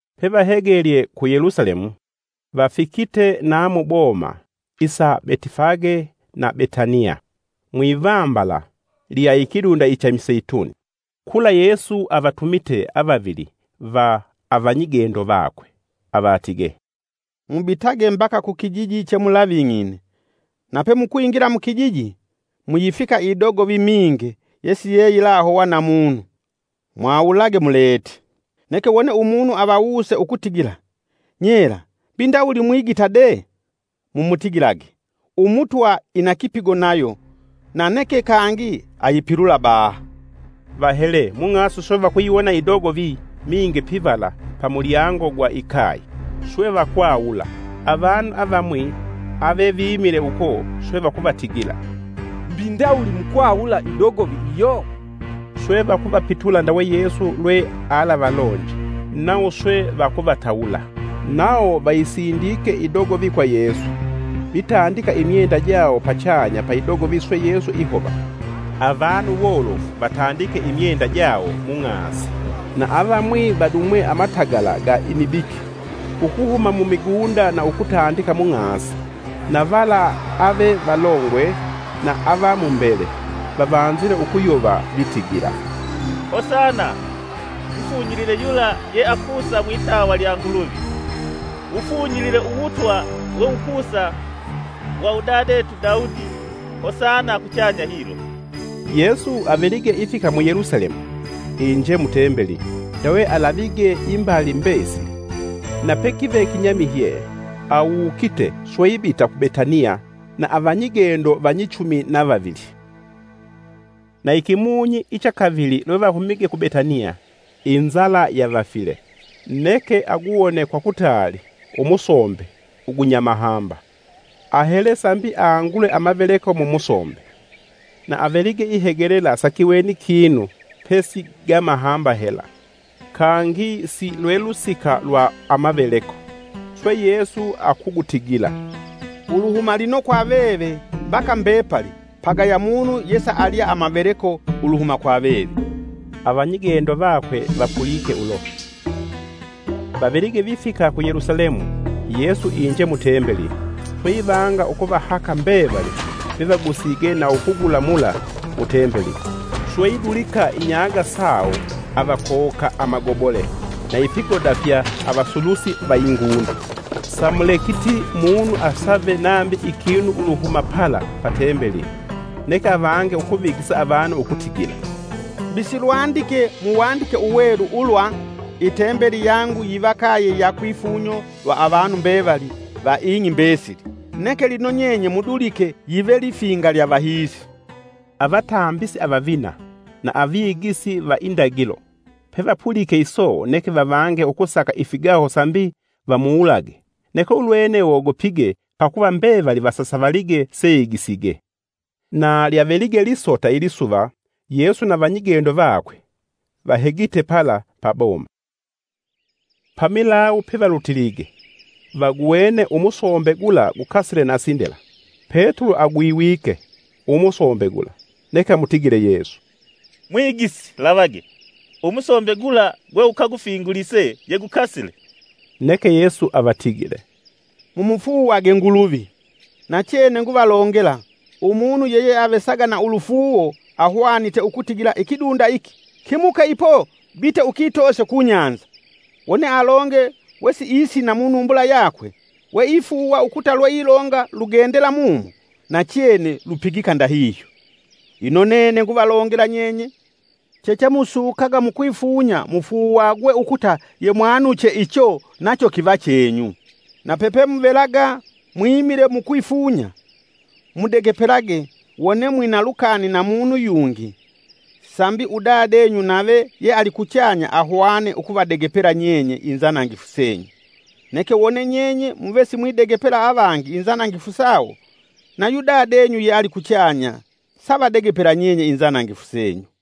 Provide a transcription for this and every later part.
Pevahegelye ku Yelusalemu vafikite na muboma isa Betifage na Betaniya, mwivambala lya ikidunda icha imiseituni. Kula Yesu avatumite avavili va avanyigendo vakwe, avatigee, “Mubitage mbaka kukijiji chemulaving'ine. Na pemukwingila mukijiji, muyifika idogovi minge yesiyeyilahowa na munu. Mwawulage mulete, neke wone umunu avawuse ukutigila, ‘Nyela mbi ndawuli mwigita de?’ Mumutigilage, ‘Umutwa ina kipigo nayo na neke kangi ayipilula baha.’” Vahele mung'asi swe vakuyiwona idogovi minge pivala pa mulyango gwa ikaye. Swe vakwawula. Avanu avamwi avevimile uko swe vakuvatigila, “Mbi ndawuli mukwawula idogovi iyo?” Swe vakuvapitula ndawe Yesu lwe alavalonje nawo swe vakuvatawula. Nawo vayisindike idogovi kwa Yesu, vitandika imyenda jawo pachanya pa idogovi swe Yesu ihova. Avanu wolofu vatandike imyenda jawo mung'asi, na avamwi vadumwe amatagala ga imibiki ukuhuma mumigunda na ukutandika mung'asi. Na vala ave valongwe na ava mumbele, vavanzile ukuyova vitigila, “Hosana! Mufunyilile yula ye akusa mwitawa lya Nguluvi! Wufunyilile Uwutwa we wukusa wa Udadetu Daudi Hosana kuchanya hilo!” Yesu avelige ifika mu Yelusalemu, inje mu Tembeli, ndawe alavige imbali mbesili. Na pekive kinyamihye, awukite swe ibita ku Betaniya na avanyigendo vanyichumi na vavili. Na ikimunyi icha kavili lwevahumige ku Betaniya inzala yavafile. Neke aguwone kwa kutaali umusombe ugunya mahamba. Ahele sambi angule amaveleko mumusombe, na avelige ihegelela sakiweni kinu pe si gamahamba hela kangi silwe lusika lwa amaveleko. Swe Yesu akugutigila, “Uluhuma lino kwa veve mbaka mbepali pagaya munu yesa alya amaveleko uluhuma kwa veve.” Avanyigendo vakwe vapulike ulo. Vavelige vifike ku Yelusalemu, Yesu inje mu Tembeli, swe ivanga ukuvahaka mbevali vevagusige na ukugula mula mu tembeli. Swe idulika inyaaga sawo avakowoka amagobole na ifigoda fya avasulusi va ingunda. Samulekiti munu asave nambi ikinu uluhuma pala pa tembeli. Neke avange ukuvigisa avanu ukutigila, “Mbi silwandike mu Waandike Uwelu ulwa, ‘Itembeli yangu yiva kaye ya kwifunyo lwa avanu mbevali va ing'i mbesili!’ Neke lino nyenye mudulike yive lifinga lya vahiisi!” Avatambisi avavina na avigisi va indagilo, pevapulike iso neke vavange ukusaka ifigaho sambi vamuwulage neke ulwene wogopige pakuva mbevali vasasavalige seigisige. Na lyavelige lisota ilisuva Yesu na vanyigendo vakwe vahegite pala pa boma. Pamilawu pevalutilige, vaguwene umusombe gula gukasile na sindela. Petulo agwiwike umusombe gula, neke amutigile Yesu, “Mwigisi, lavage! Umusombe gula gwe ukagufingulise yegukasile!” Neke Yesu avatigile, “Mumufuuwage Nguluvi. Nachene, nguvalongela, umunu yeyeavesaga na ulufuuwo ahwanite ukutigila ikidunda iki, ‘Kimuke ipo bite ukitoose kunyanza!’ Wone alonge wesiisina munumbula yakwe, we ifuuwa ukuta lweilonga, lugendela mumo, nachene lupigika ndahihyo. Ino nene nguvalongela nyenye, chechemusukaga mukwifunya mufuuwagwe ukuta yemwanuche icho, nacho kiva chenyu. Na pepemuvelaga mwimile mukwifunya, mudegepelage, wone mwina lukani na munu yungi; sambi udadenyu nave yealikuchanya ahwane ukuvadegepela nyenye inzanangifu senyu. [ Neke wone nyenye muve simwidegepela avangi inzanangifu sawo, nayu dadenyu yeali kuchanya savadegepela nyenye inzanangifu senyu.”]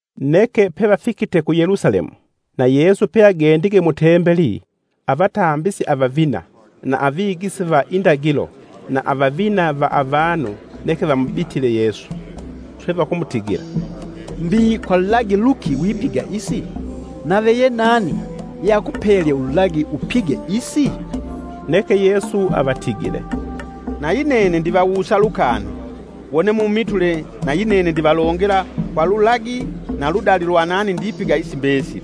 Neke pevafikite ku Yelusalemu, na Yesu peagendige mu Tembeli avatambisi avavina na avigisi va indagilo na avavina va avanu neke vamubitile Yesu, swe vakumutigila, “Mbi kwa lulagi luki wipiga isi? Nave ye nani yeakupelye ululagi upige isi?” Neke Yesu avatigile, “Nayi nene ndivawusa lukani, wone mumitule nayinene ndivalongela kwa lulagi na ludali lwa nani ndipiga isi mbesili.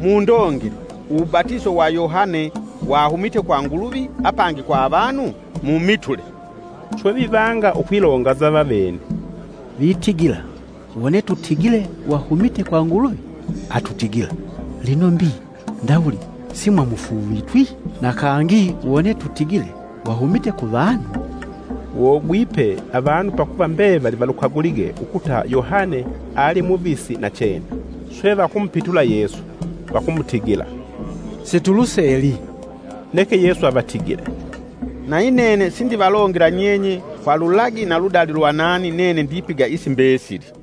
Mundongele, uwubatiso wa Yohane wahumite kwa Nguluvi apangi kwa avanu? Mumitule.” Swe vivanga ukwilonganza vavene, “Vitigila, ‘Wone tutigile wahumite kwa Nguluvi’, atutigila, ‘Lino mbi ndawuli simwamufuuvitwi?’ Na kangi wone tutigile, ‘Wahumite ku vanu’” (Wogwipe avanu pakuva mbevali valukagulige ukuta Yohane ali muvisi nachene.) Swe vakumupitula Yesu, vakumutigila, “Situluseli.” Neke Yesu avatigile, “Nayi nene sindivalongela nyenye kwa lulagi na ludali lwa nani nene ndipiga isi mbesili.”